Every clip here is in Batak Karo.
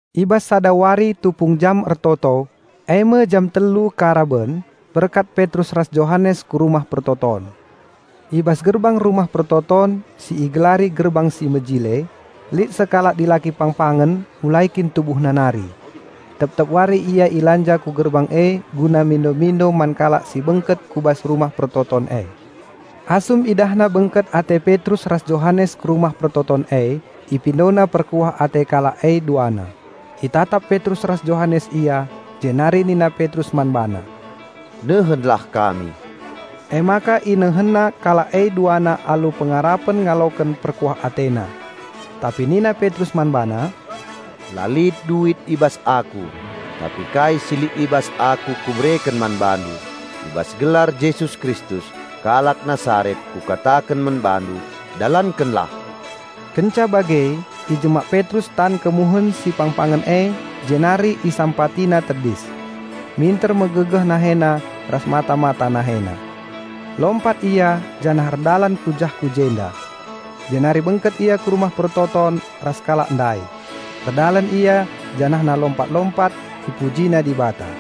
I bas sada wari tupung jam ertoto, eme jam telu karaben, berkat Petrus ras Johanes ku Rumah Pertoton. I bas gerbang Rumah Pertoton si igelari Gerbang si Mejile, lit sekalak dilaki pangpangen mulai kin tubuhna nari. Tep-tep wari ia ilanja ku gerbang e guna mindo-mindo man kalak si bengket ku bas Rumah Pertoton e. Asum idahna bengket ate Petrus ras Johanes ku Rumah Pertoton e, ipindona perkuah ate kalak e duana. Itatap Petrus ras Johanes ia, jenari nina Petrus man bana, "Nehenlah kami." Emaka inehenna kalak e duana alu pengarapen ngaloken perkuah atena. Tapi nina Petrus man bana, "La lit duit i bas aku, tapi kai si lit i bas aku kubereken man bandu: I bas gelar Jesus Kristus, kalak Nasaret, kukataken man bandu, dalankenlah!" Kenca bage ijemak Petrus tan kemuhen si pangpangen e jenari isampatina tedis. Minter megegeh nahena ras mata-mata nahena. Lompat ia janah erdalan kujah-kujenda. Jenari bengket ia ku Rumah Pertoton ras kalak ndai; erdalan ia janahna lompat-lompat ipujina Dibata.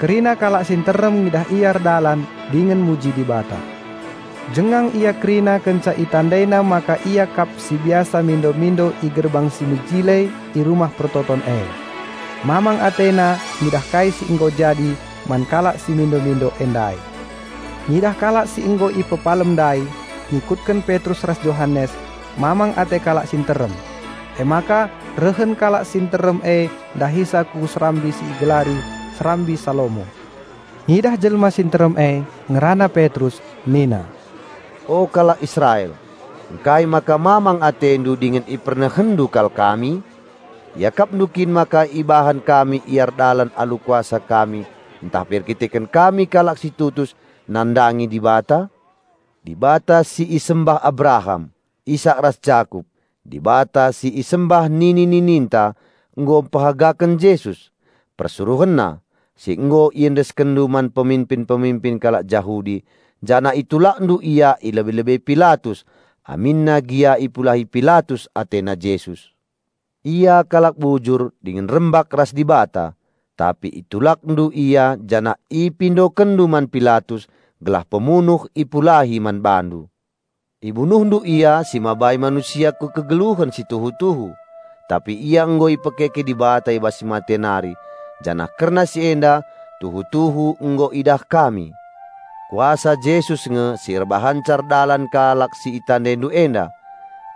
Kerina kalak si nterem ngidah ia erdalan dingen muji Dibata. Jengang ia kerina kenca itandaina maka ia kap si biasa mindo-mindo i Gerbang si Mejile i Rumah Pertoton e. Mamang atena ngidah kai si nggo jadi man kalak si mindo-mindo e ndai. Ngidah kalak si nggo ipepalem ndai ngikutken Petrus ras Johanes, mamang ate kalak si nterem. Emaka rehen kalak si nterem e ndahisa ku serambi si igelari "Serambi Salomo". Ngidah jelma si nterem e, ngerana Petrus nina, "O kalak Israel, ngkai maka mamang atendu dingen ipernehenndu kal kami? Iakapndu kin maka ibahan kami ia erdalan alu kuasa kami ntah pe erkiteken kami kalak si tutus nandangi Dibata? Dibata si isembah Abraham, Isak ras Jakup, Dibata si isembah nini-nininta nggo mpehagaken Jesus, PersuruhenNa, si nggo iendeskenndu man peminpin-peminpin kalak Jahudi janah itulakndu Ia i lebe-lebe Pilatus aminna gia ipulahi Pilatus atena Jesus. Ia kalak bujur dingen rembak ras Dibata. Tapi itulakndu Ia janah ipindokenndu man Pilatus gelah pemunuh ipulahi man bandu. Ibunuhndu Ia si mabai manusia ku kegeluhen si tuhu-tuhu. Tapi Ia nggo ipekeke Dibata i bas si mate nari janah kerna si enda tuhu-tuhu nggo idah kami. Kuasa Jesus nge si erbahanca erdalan kalak si itandaindu enda.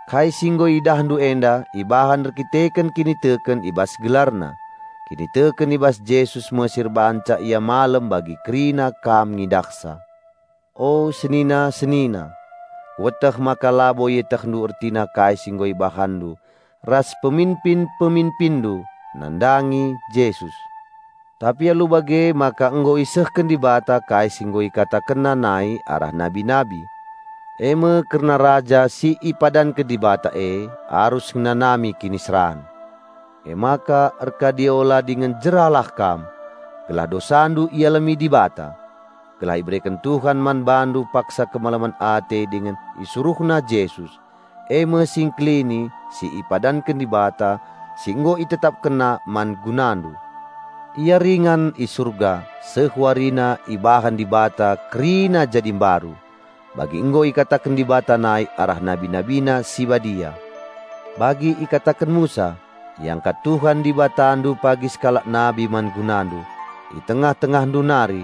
Kai si nggo idahndu enda ibahan erdandanken kiniteken i bas GelarNa; kiniteken i bas Jesus me si erbahanca ia malem bagi kerina kam ngidahsa. O Senina-senina, kueteh maka labo ietehndu ertina kai si nggo ibahanndu ras peminpin-peminpinndu nandangi Jesus. Tapi alu bage maka nggo isehken Dibata kai si nggo IkatakenNa nai arah nabi-nabi. Eme kerna Raja si ipadanken Dibata e arus ngenanami kiniseran. Emaka erkadiola dingen jeralah kam gelah dosandu ialemi Dibata. Gelah ibereken Tuhan man bandu paksa kemalemen ate dingen IsuruhNa Jesus, eme Si Engkelini si ipadanken Dibata si nggo ItetapkenNa man gunandu. Ia ringan i Surga seh warina ibahan Dibata kerina jadi mbaru, bagi nggo ikataken Dibata nai arah Nabi NabiNa si badia. Bagi ikataken Musa, 'Iangkat Tuhan Dibatandu pagi sekalak nabi man gunandu, i tengah-tengahndu nari,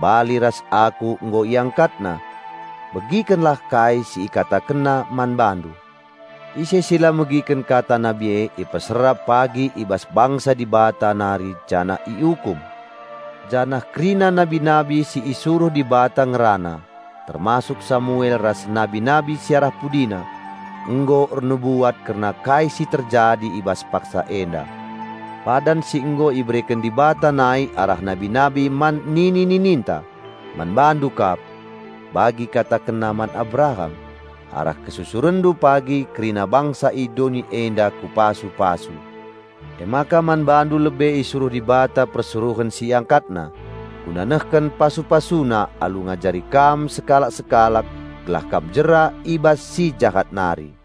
bali ras aku nggo IangkatNa. Begikenlah kai si ikatakenna man bandu. Ise si la megiken kata nabi e ipeserap pagi i bas bangsa Dibata nari janah iukum.' Janah kerina nabi-nabi si isuruh Dibata ngerana, termasuk Samuel ras nabi-nabi si arah pudina, nggo ernubuat kerna kai si terjadi i bas paksa enda. Padan si nggo ibereken Dibata nai arah nabi-nabi man nini-nininta, man bandu kap. Bagi IkatakenNa man Abraham, 'Arah kesusurenndu pagi kerina bangsa i doni enda Kupasu-pasu.' Emaka man bandu lebe isuruh Dibata Persuruhen si IangkatNa, guna nehken pasu-PasuNa alu ngajari kam sekalak-sekalak gelah kam jera i bas si jahat nari."